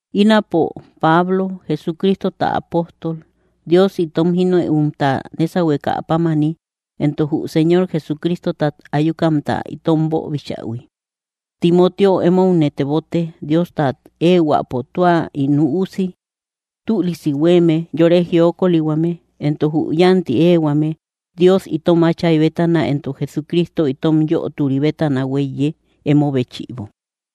Ínapo, Pablo, Jesucristota apóstol, Dios itom jínëumta nésahuekä pámani, entok jü Señor Jesucristotat ayukamta itom boobichähui: Timoteo emoune tebote, Diostat ehuäpo tua ín üusi: tülisi huéeme, yore jiokolihuame, entok jü yánti éehuame, Dios itom Áchay bétana entok Jesucristo itom Yöturi bétana huéiye, emo béchïbo.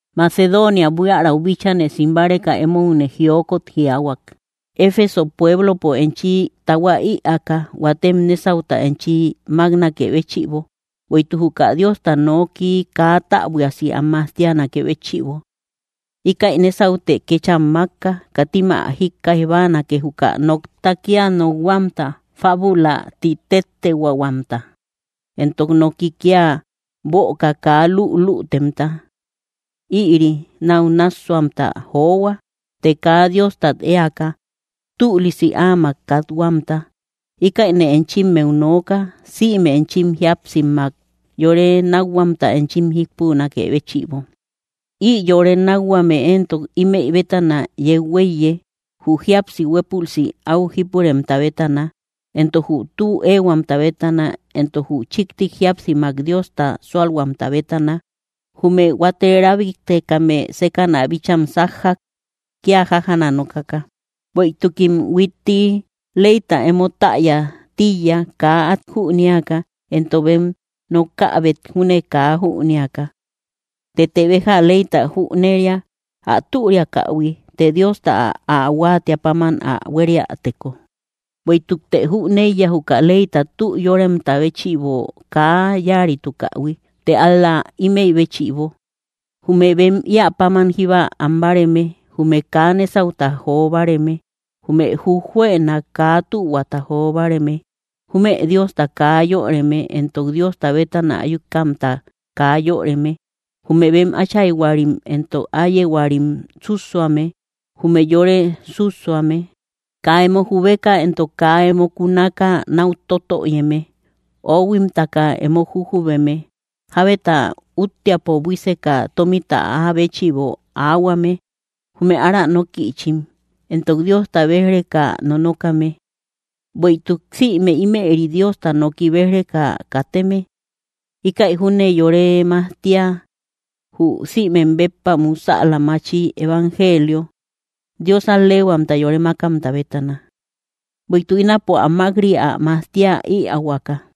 Macedonia buiärau bíchane sim báreka emoune jiokot jiaahuak, Efeso pueblopo enchi tahua ïaaka, huatem nésauta enchi máknakë béchïbo, bueïtuk juka Diosta nooki kaa täbuiasi am majtianakë béchïbo. Íkäi nésautë kécham mákka: Katim ä jíkkaij báanake, juka nokta kía nokhuamta fábula ti tettehuaahuamta, entok noki kía böka kaa lülütemta. Ïri náu nássuahuamta johua, të kaa Diostat éaka, tülisi áamak kathuamta. Ïkäine enchimmeu nooka, sïme enchim jíapsimak yore nákhuamta enchim jípunakë béchïbo. Ï yore nákhuame éntok ímëi bétana yeu huéiye: jü jíapsi huépülsi áu jípuremta bétana, entok jü tü éehuamta bétana, entok jü chíkti jíapsimak Diosta súalhuamta bétana. Jume huate rábiktekame sékäna bícham sájjak, kía jájaana nokaka. Bueïtukim huitti leyta emo täya tíiya, kaa át jünéaka, entok bem nokäbet júne kaa jünéaka. Tëte béja leyta jüneria, ä türiakähui, të Diosta ä huáatiä páman ä huériäteko. Bueïtukte jüneiya, jükä leyta tü yóremta béchïbo kaa yáaritukähui, të ál‑la ímëi béchïbo: jume bem íä páman jíba am báareme, jume kaa nésauta jo báareme, jume jujjuëna kaa tühuata jo báareme, jume Diosta kaa yöreme entok Diosta bétana ayukamta kaa yöreme, jume bem áchayhuarim entok áyehuarim sússuame, jume yore sússuame, kaa emo jubeka entok kaa emo kunaka náu totöyeme, oohuimtaka emo jujubeme, jábeta úttiapo buíseka tómita áa béchïbo aahuame, jume ára nókïchim, entok Diosta béj‑reka nonokame; bueïtuk sïme ímëri Diosta noki béj‑reka kateme. Íkäi júne yore majtia, jü sïmek béppa musäla machi evangelio, Dios al‑leehuamta yore mákamta bétana. Bueïtuk ínapo ä mák‑ri, ä majtiä ïaahuaka.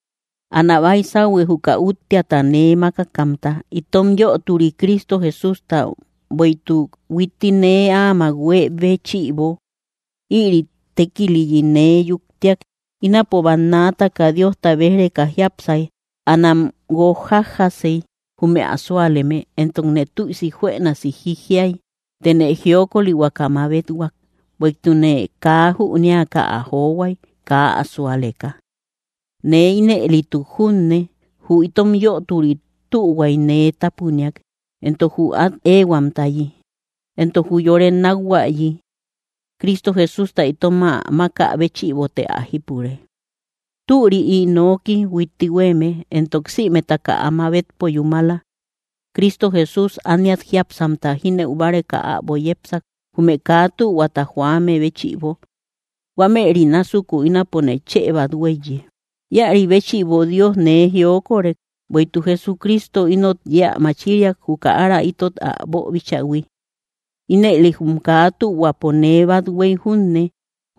Anä baisauhue, juka úttiata nee mákakamta, itom Yöturi Cristo Jesústa, bueïtuk huitti nee áamak huée béchïbo; ïri tékiliyi nee yuktiak. Ínapo bannaataka Diosta béj‑reka jiápsay. Anam guók jájjasey, jume ä súaleme, entokne tüisi juënasi jijiay. Tëne jiokolihuaka mabethuak, bueïtukne kaa jünéaka ä johuay, kaa ä súaleka. Nee ínëlituk junne, jü itom Yöturi tühuay nee tápuniak, entok jü át éehuamtayi, entok jü yore nákhuayi; Cristo Jesústa itom ä mákä béchïbote ä jípure. Türi ï nooki huitti huéeme, entok sïmetaka ä mabetpo yúmala: Cristo Jesús ániat jiápsamta jínëu báreka äbo yepsak, jume kaa tühuata joame béchïbo; huámëri násuku ínapone chë bát huéiye. Íäri béchïbo Dios nee jiokorek: bueïtuk Jesucristo inot yeä machiriak, juka ára itot ä boobichähui. Ínëli jum kaa tühuapo nee bát huéy junne,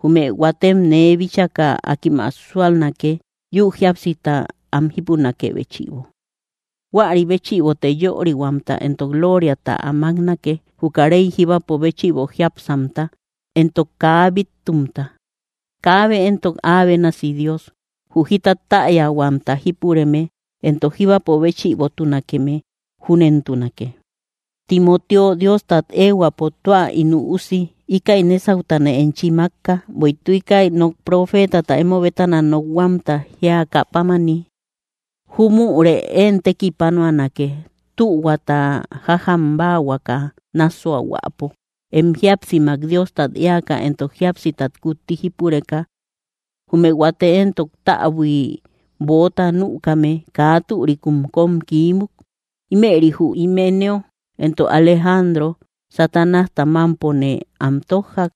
jume huatem nee bíchaka, akim ä súalnake, yúu jíapsita am jípunakë béchïbo. Huäri béchïbote yörihuamta entok lóoriata ä máknake, juka Rey jíbapo béchïbo jiápsamta entok kaa bíttumta. ¡Kaabe éntok Áa bénasi Dios, jü jita täyahuamta jípureme, entok jíbapo béchïbotunakeme! ¡Júnentunake! Timoteo, Diostat ehuäpo tua ín üusi, íkäi nésautane enchi mákka, bueïtuk íkäi nok profeetata emo bétana nokhuaamta jíakä pámani. Júmürë én tekipanuanake, tühuata jájam báahuaka nássuahuäpo, em jíapsimak Diostat éaka entok jíapsitat kutti jípureka. Jume huate éntok, täbui böota nükame, kaa türikum kóm kiímuk. Ímëri jü Himeneo entok Alejandro, Satanásta mámpone am tójjak,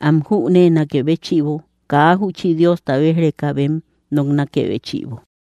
am jüneenakë béchïbo, kaa júchi Diosta béj‑reka bem noknakë béchïbo.